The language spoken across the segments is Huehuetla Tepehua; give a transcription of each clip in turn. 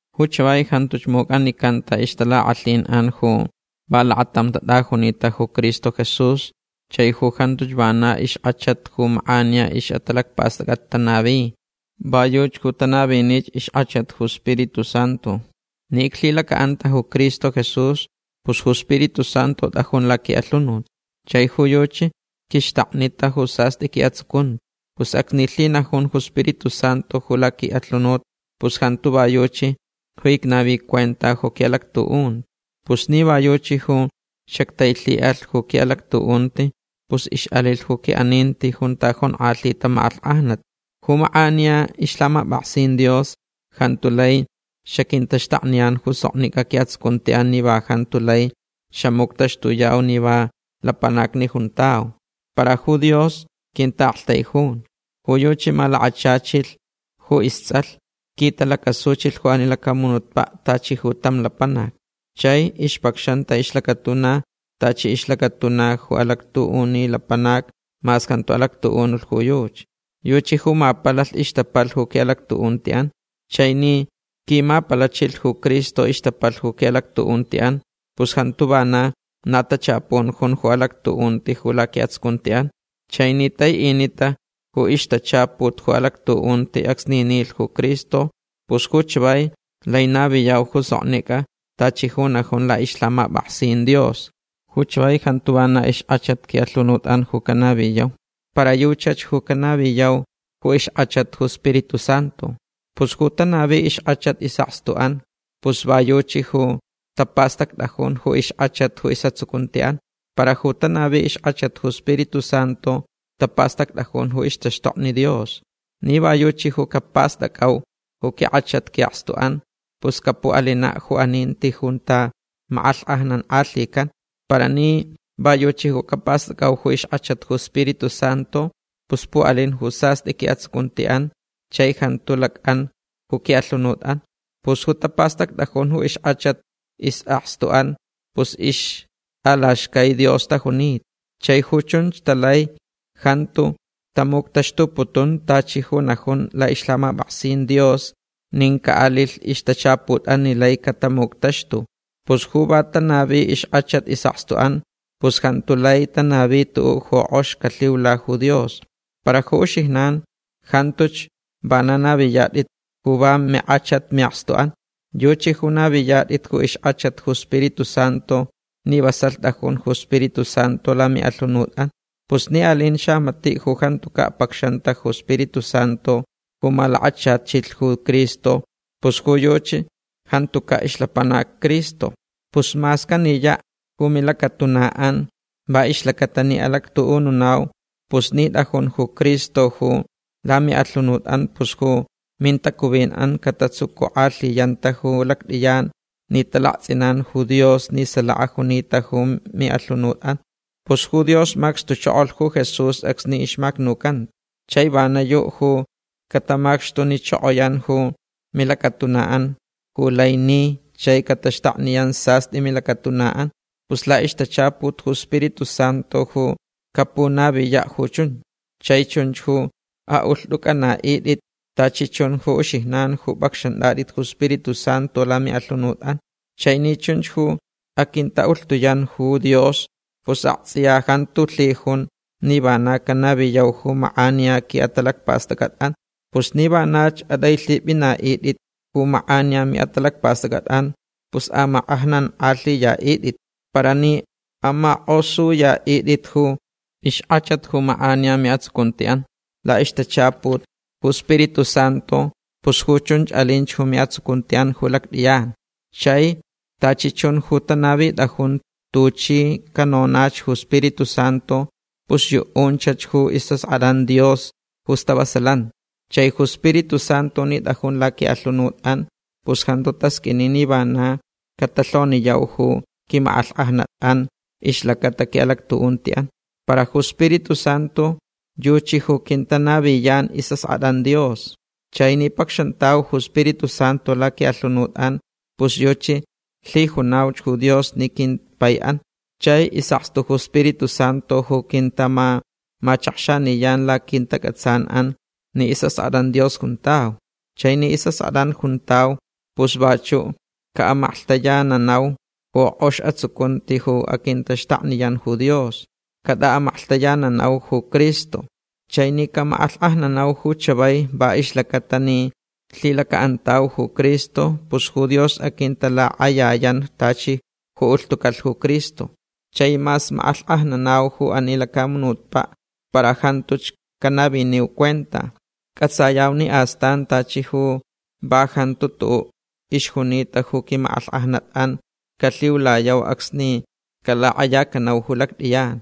Ju chavai jantuch muc'anicanta ixtalak'alhin'an ju va lakatam tat'ajunita ju Cristo Jesús chai ju jantuch vana ixk'achat ju mak'aniya ix'atalacpast'ac'at'an tanavi. Va yuchi ju tanavinich ixk'achat ju Spiritu Santu. Ni iclhilaca'anta ju Cristo Jesús pus ju Spiritu Santu t'ajun laqui'alhunut. Chai ju yuchi quixtaknita ju sast'i qui'atsucunti. Pus acsni lhinajun ju Spiritu Santu ju laqui'alhunut pus jantu va yuchi ju icnavi cuenta ju qui'alactu'unti. Pus ni va yuchi ju xactailhi'alh ju qui'alactu'unti pus ix'alilh ju qui'aninti junta jonk'alhita mak'alhk'ajnat. Ju mak'aniya ixlhamap'aksin Dios jantu lai xaquintaxtakniyan ju soknic'a qui'atsucunti'an ni va jantu lai xamuctaxtuyau ni va lapanacni juntau. Para ju Dios quinta'aktaijun. Ju yuchi malakachachilh ju ists'alh. Quitalacasuchilh ju ani lacamunutpa' tachi ju tam lapanac. Chai ixpacxanta ixlacatuna tachi ixlacatuna ju alactu'uni lapanac mas jantu alactu'unulh ju yuchi. Yuchi ju mapalalh ixtapalh ju qui'alactu'unti'an. Chai ni quimapalachilh ju Cristo ixtapalh ju qui'alactu'unti'an pus jantu vana na tachapun jun ju alactu'unti ju laqui'atsucunti'an. Chai ni tai'inita ju ixtachaput ju alactu'unti acsni nilh ju Cristo pus ju chavai lai naviyau ju soknic'a tachi ju najun la'ixlhamap'aksin Dios. Ju chavai jantu vana ixk'achat qui'alhunut'an ju canaviyau. Para yuchach ju canaviyauch ju ixk'achat ju Spiritu Santu. Pus ju tanavi ixk'achat is'akstu'an pus va yuchi ju tapastact'ajun ju ixk'achat ju is'atsucunti'an. Para ju tanavini ixk'achat ju Spiritu Santu tapastact'ajun ju ixtaxtokni Dios. Ni va yuchi ju capast'ac'au ju quink'achat qui'akstu'an pus capu'alina' ju aninti junta mak'alhk'ajnank'alhican. Para ni va yuchi ju capast'ac'au ju ixk'achat ju Spiritu Santu pus pu'alin ju sast'i qui'atsucunti'an chai jantu lac'an ju qui'alhunut'an. Pus ju tapastact'ajun ju ixk'achat is'akstu'an pus ixt'alaxcai Dios tajunita. Chai ju chunch talai jantu tamuctaxtuputun tachi ju najun la'ixlhamap'aksin Dios nin ca'alilh ixtachaput'an ni lai catamuctaxtulh. Pus ju va tanavi ixk'achat is'akstu'an pus jantu lai tanavi tu'u' ju k'ox calhiula ju Dios. Para ju uxijnan jantuch vana naviyat'it ju va mink'achat'an mi'akstu'an. Yuchi ju naviniyat'it ju ixk'achat ju Spiritu Santu ni vasalh t'ajun ju Spiritu Santu lami'alhunut'an. Pus ni alin xamati' ju jantuca' pacxanta ju Spiritu Santu ju malakachachilh ju Cristo pus ju yuchi jantuca' ixlapanac Cristo. Pus mas caniya' ju milacatuna'an va ixlaca'atalh ni alactu'ununau para ni t'ajun ju Cristo ju lami'alhunut'an pus ju mintacuvin'an catatsucuk'alhiyanta ju lact'iyan ni talakts'inan ju Dios ni salaka junita ju mi'alhunut'an. Pus ju Dios macxtuchokolh ju Jesús acsni ixmacnucanta. Chai vana yu' ju catamacxtunichokoyan ju milacatuna'an ju lai ni chai cataxtakniyan sast'i milacatuna'an. Pus la'ixtachaput ju Spiritu Santu ju capunaviya' ju chunch. Chai chunch ju a'ulht'uc'ana'it'it tachi chun ju uxijnan ju p'acxant'at'it ju Spiritu Santu lami'alhunut'an. Chai ni chunch ju aquinta'ulhtuyan ju Dios pus akts'iya jantu lhijun ni vana canaviyau ju mak'aniya qui'atalacpast'ac'at'an. Pus ni vanach at'ailhip'ina'it'it ju mak'aniya mi'atalacpast'ac'at'an pus amak'alhk'ajnank'alhiya'it'it. Para ni amak'osuya'it'it ju ixk'achat ju mak'aniya mi'atsucunti'an la'ixtachaput ju Spiritu Santu pus ju chunch alinch ju mi'atsucunti'an ju lact'iyan. Chai tachi chun ju tanavit'ajun tuchi canonach ju Spiritu Santu pus yu'unchach ju is'ask'at'an Dios ju stavasalanti. Chai ju Spiritu Santu ni t'ajun laqui'alhunut'an pus jantu tasq'uini ni vana catalhoniyau ju quimak'alhk'ajnat'an ixlacata qui'alactu'unti'an. Para ju Spiritu Santu yuchi ju quintanaviyan is'ask'at'an Dios. Chai ni pacxantau ju Spiritu Santu laqui'alhunut'an pus yuchi lhijunauch ju Dios ni quimpai'an. Chai is'akstu ju Spiritu Santu ju quintamamachakxaniyan laquintac'atsan'an ni is'ask'at'an Dios juntau. Chai ni is'ask'at'an juntau pus vachu' ca'amaklhtayananauch ju k'ox atsucunti ju aquintaxtakniyan ju Dios. Cat'a'amaklhtayananauch ju Cristo. Chai ni camak'alhk'ajnanau ju chavai va ixlaca'atalh ni lhilaca'antauch ju Cristo pus ju Dios aquintalak'ayayan tachi ju ulhtucalh ju Cristo. Chai mas mak'alhk'ajnanauch ju ani lacamunutpa' para jantuch canaviniu cuenta. C'atsayau ni astan tachi ju va jantu tu'u' ixjunita ju quimak'alhk'ajnat'an calhiulayau acsni calak'ayacanau ju lact'iyan.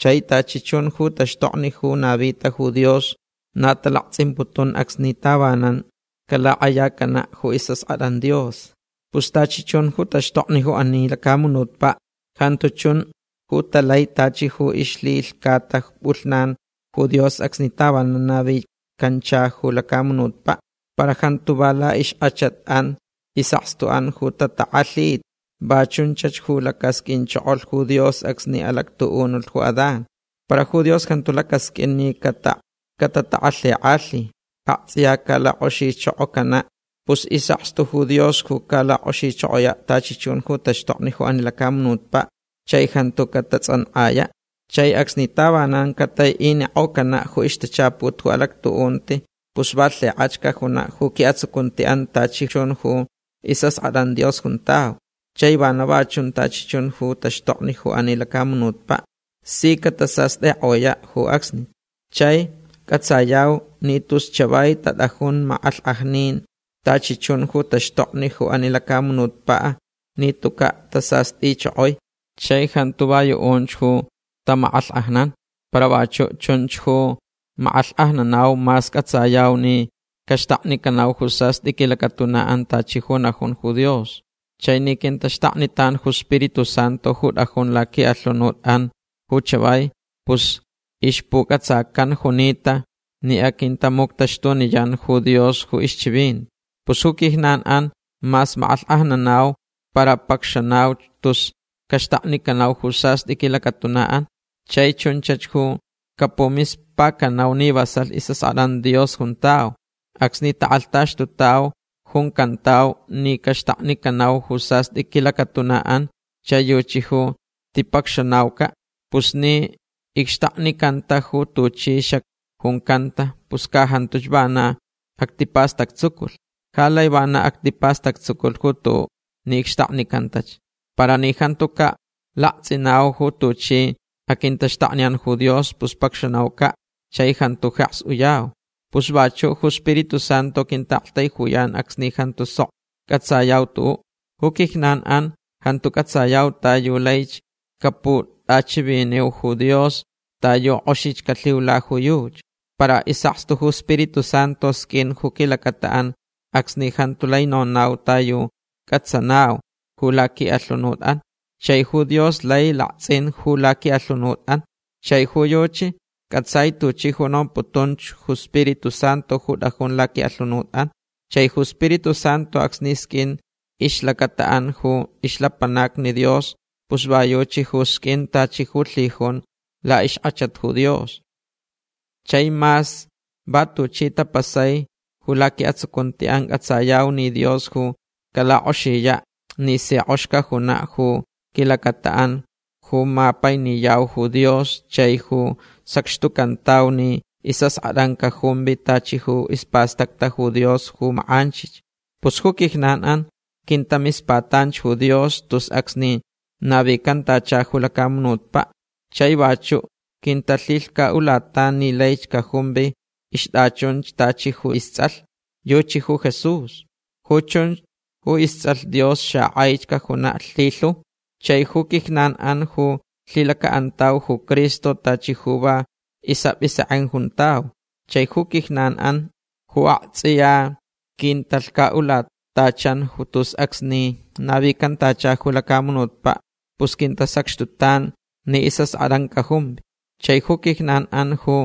Chai tachi chun ju taxtokni ju navita ju Dios na talakts'imputun acsni tavanan calak'ayacana' ju is'ask'at'an Dios. Pus tachi chun ju taxtokni ju ani lacamunutpa' jantu chun ju talai tachi ju ixlhilhcata p'ulhnan ju Dios acsni tavanan navicanchalh ju lacamunutpa'. Para jantu va la'ixk'achat'an is'asktu'an ju tatak'alhita. Va chunchach ju lacasq'uinchokolh ju Dios acsni alactu'unulh ju Adán. Para ju Dios jantu calacasq'uinach ni catatak'alhik'alhi. Akts'iya calak'oxichokocanach. Pus is'akstu ju Dios ju calak'oxichokoya' tachi chun ju taxtokni ju ani lacamunutpa' chai jantu catats'ank'aya'. Chai acsni tavanan catai'inik'ocana' ju ixtachaput ju alactu'unti pus va lhik'ach cajuna' ju qui'atsucunti'an tachi chun ju is'ask'at'an Dios juntau. Chai vana va chun tachi chun ju taxtokni ju ani lacamunutpa'. Si catasast'ik'oya' ju acsnich. Chai c'atsayau ni tus chavai tat'ajun mak'alhk'ajnin tachi chun ju taxtokni ju ani lacamunutpa' ni tuca' tasast'ichokoi. Chai jantu va yu'unch ju tamak'alhk'ajnan. Para vachu' chunch ju mak'alhk'ajnanau mas c'atsayau ni caxtaknicanau ju sast'i quilacatuna'an tachi ju najunta ju Dios. Chai ni quintaxtaknitan ju Spiritu Santu ju t'ajun laqui'alhunut'an ju chavai pus ixpuc'atsacan junita ni aquintamuctaxtuniyan ju Dios ju ixchivinti. Pus ju quijnan'an mas mak'alhk'ajnanau para pacxanauch tus caxtaknicanau ju sast'i quilacatuna'an. Chai chunchach ju capumispacanau ni vasalh is'ask'at'an Dios juntau. Acsni tak'alhtaxtutauch juncantau ni caxtaknicanau ju sast'i quilacatuna'an chai yuchi ju tipacxanauca'. Pus ni icxtaknicanta ju tuchi xacjuncanta pus ca jantuch vana actipastactsuculh. Ja lai vana actipastactsuculh ju tu'u ni icxtaknicantach. Para ni jantuca' lakts'inau ju tuchi aquintaxtakniyan ju Dios pus pacxanauca' chai jantu jeks uyau. Pus vachu' ju Spiritu Santu quinta'aktaijuyan acsni jantu sok c'atsayau tu'u'. Ju quijnan'an jantu c'atsayau ta yu laich caput'achiviniu ju Dios ta yu k'oxich calhiula ju yuchi. Para is'akstu ju Spiritu Santu sq'uin ju quilacata'an acsni jantu lai nonau ta yu c'atsanau ju laqui'alhunut'an. Chai ju Dios lai lakts'in ju laqui'alhunut'an. Chai ju yuchi c'atsai tuchi ju nomputun ju Spiritu Santu ju t'ajun laqui'alhunut'an. Chai ju Spiritu Santu acsni sq'uin ixlacata'an ju ixlapanacni Dios pus va yuchi ju sq'uin tachi ju lhijunch la'ixk'achat ju Dios. Chai mas va tuchi tapasai ju laqui'atsucunti'an c'atsayau ni Dios ju calak'oxiya' ni si k'ox cajuna' ju quilacata'an ju mapainiyau ju Dios chai ju sacxtucantau ni is'ask'at'an cajumvi tachi ju ispastacta ju Dios ju mak'anchich. Pus ju quijnan'an quintamispatanch ju Dios tus acsni navicantacha ju lacamunutpa'. Chai vachu' quintalhilhca'ulatan ni laich cajumvi ixt'achunch tachi ju ists'alh. Yuchi ju Jesús. Ju chunch ju ists'alh Dios xak'ai cajuna' lhilhu. Chai ju quijnan'an ju lhilaca'antau ju Cristo tachi ju va is'ap'isek'en juntau. Chai ju quijnan'an ju akts'iya quintalhca'ulatachan tus acsni navicantacha ju lacamunutpa' pus quintasacxtutan ni is'ask'at'an cajumvi. Chai ju quijnan'an ju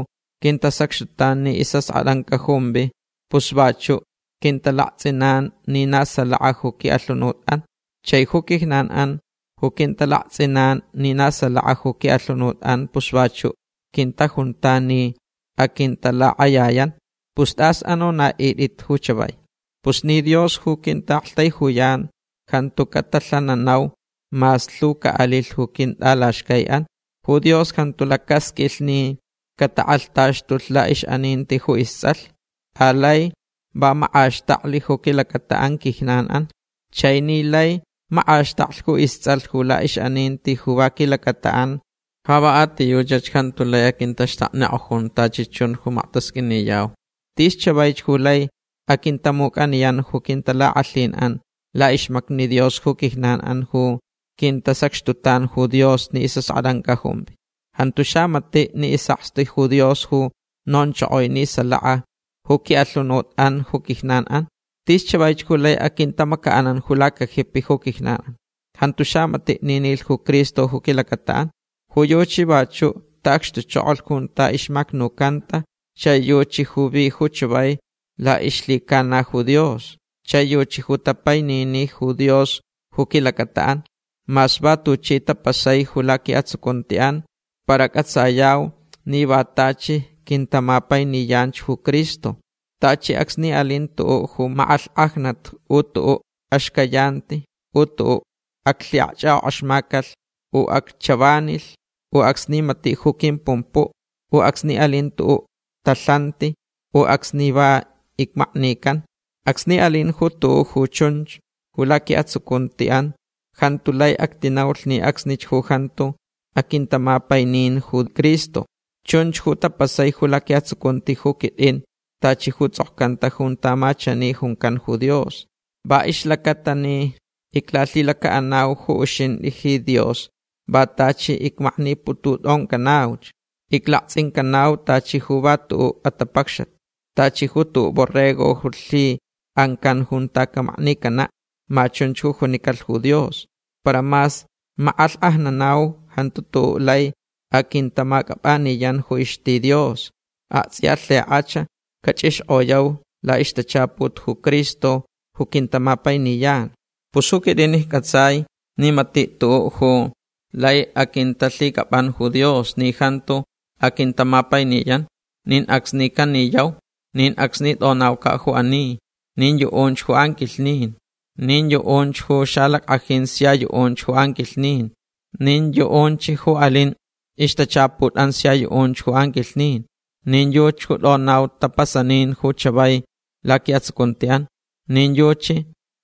quintasacxtutan ni is'ask'at'an cajumvi pus vachu' quintalakts'inanch ni na salaka ju qui'alhunut'an. Chai ju quijnan'an ju quintalakts'inanch ni na salaka ju qui'alhunut'an pus vachu' quintajuntan ni aquintalak'ayayan. Pus tas anona'it'itch ju chavai. Pus ni Dios ju quinta'aktaijuyan jantu catalhananau mas lhu ca'alilh ju quint'alaxcai'an. Ju Dios jantu lacasq'uilh ni catak'alhtaxtulh la'ix'aninti ju ists'alh. Alai va mak'axtaklh ju quilacata'an quijnan'an. Chai ni lai mak'axtaklh ju ists'alh ju la'ix'aninti ju va quilacata'an ja va a ti yuchach jantu lai aquintaxtaknik'ojun tachi chun ju maktasq'uiniyau. Tis chavaich ju lai quintamuc'aniyan ju quintalak'alhin'an la'ixmacni Dios ju quijnan'an ju quintasacxtutan ju Dios ni is'ask'at'an cajumvi. Jantu xamati' ni is'akstu ju Dios ju nonchokoi ni salaka ju qui'alhunut'an ju quijnan'an. Tis chavaich ju lai aquintamaca'an ju lacajipi ju quijnan'an. Jantu xamati' ni nilh ju Cristo ju quilacata'an. Ju yuchi vachu' ta'acxtuchokolh junta ixmacnucanta chai yuchi ju vi ju chavai la'ixlhicana ju Dios. Chai yuchi ju tapaininich ju Dios ju quilacata'an. Mas va tuchi tapasaich ju laqui'atsucunti'an para c'atsayauch ni va tachi quintamapainiyanch ju Cristo. Tachi acsni alin tu'u' ju mak'alhk'ajnat u tu'u' axcayanti u tu'u' aclhi'akch'ak'ok'axmacalh u acchavanilh u acsni mati' ju quimpumpu' u acsni alin tu'u' talhanti u acsni va icmaknican. Acsni alin ju tu'u' ju chunch ju laqui'atsucunti'an jantu lai actinaulh ni acsnich ju jantu aquintamapainin ju Cristo. Chunch ju tapasai ju laqui'atsucunti ju quit'in tachi ju ts'okcanta junta ma chani juncan ju Dios: Va ixlacata ni iclalhilaca'anau ju uxint'i ji Dios va tachi icmakniputut'oncanauch. Iclakts'incanauch tachi ju va tu'u' atapacxat. Tachi ju tu'u' borrego ju lhi'ancan junta camaknicana'. Ma chunch ju junicalh ju Dios. Para mas mak'alhk'ajnanau jantu tu'u' lai aquintamac'ap'aniyan ju ixti Dios. Akts'iya lhik'ach cach'ixk'oyau la'ixtachaput ju Cristo ju quintamapainiyan. Pus ju quit'in icc'atsai ni mati' tu'u' ju lai aquintalhic'ap'an ju Dios ni jantu aquintamapainiyan. Nin acsni caniyau. Nin acsni t'onauca' ju ani. Nin yu'unch ju anquilhnin. Nin yu'unch ju xalack'ajin sia yu'unch ju anquilhnin. Nin yu'unch ju alin ixtachaput'an sia yu'unch ju anquilhnin. Nin yuchi ju t'onau tapasanin ju chavai laqui'atsucunti'an. Nin yuchi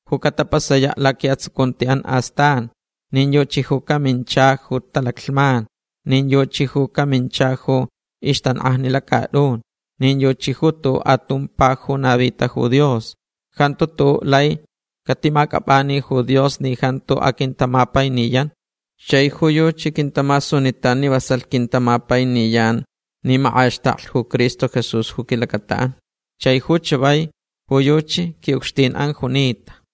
ju catapasaya' laqui'atsucunti'an astan. Nin yuchi ju camincha ju talaclhman. Nin yuchi ju camincha ju ixtank'ajni lacat'un. Nin yuchi ju tu'u' atumpa ju navita ju Dios. Jantu tu'u' lai catimac'ap'ani ju Dios ni jantu aquintamapainiyan. Chai ju yuchi quintamasunitan ni vasalh quintamapainiyan ni mak'axtaklh ju Cristo Jesús ju quilacata'an. Chai ju chavai ju yuchi qui'ucxtin'an junita.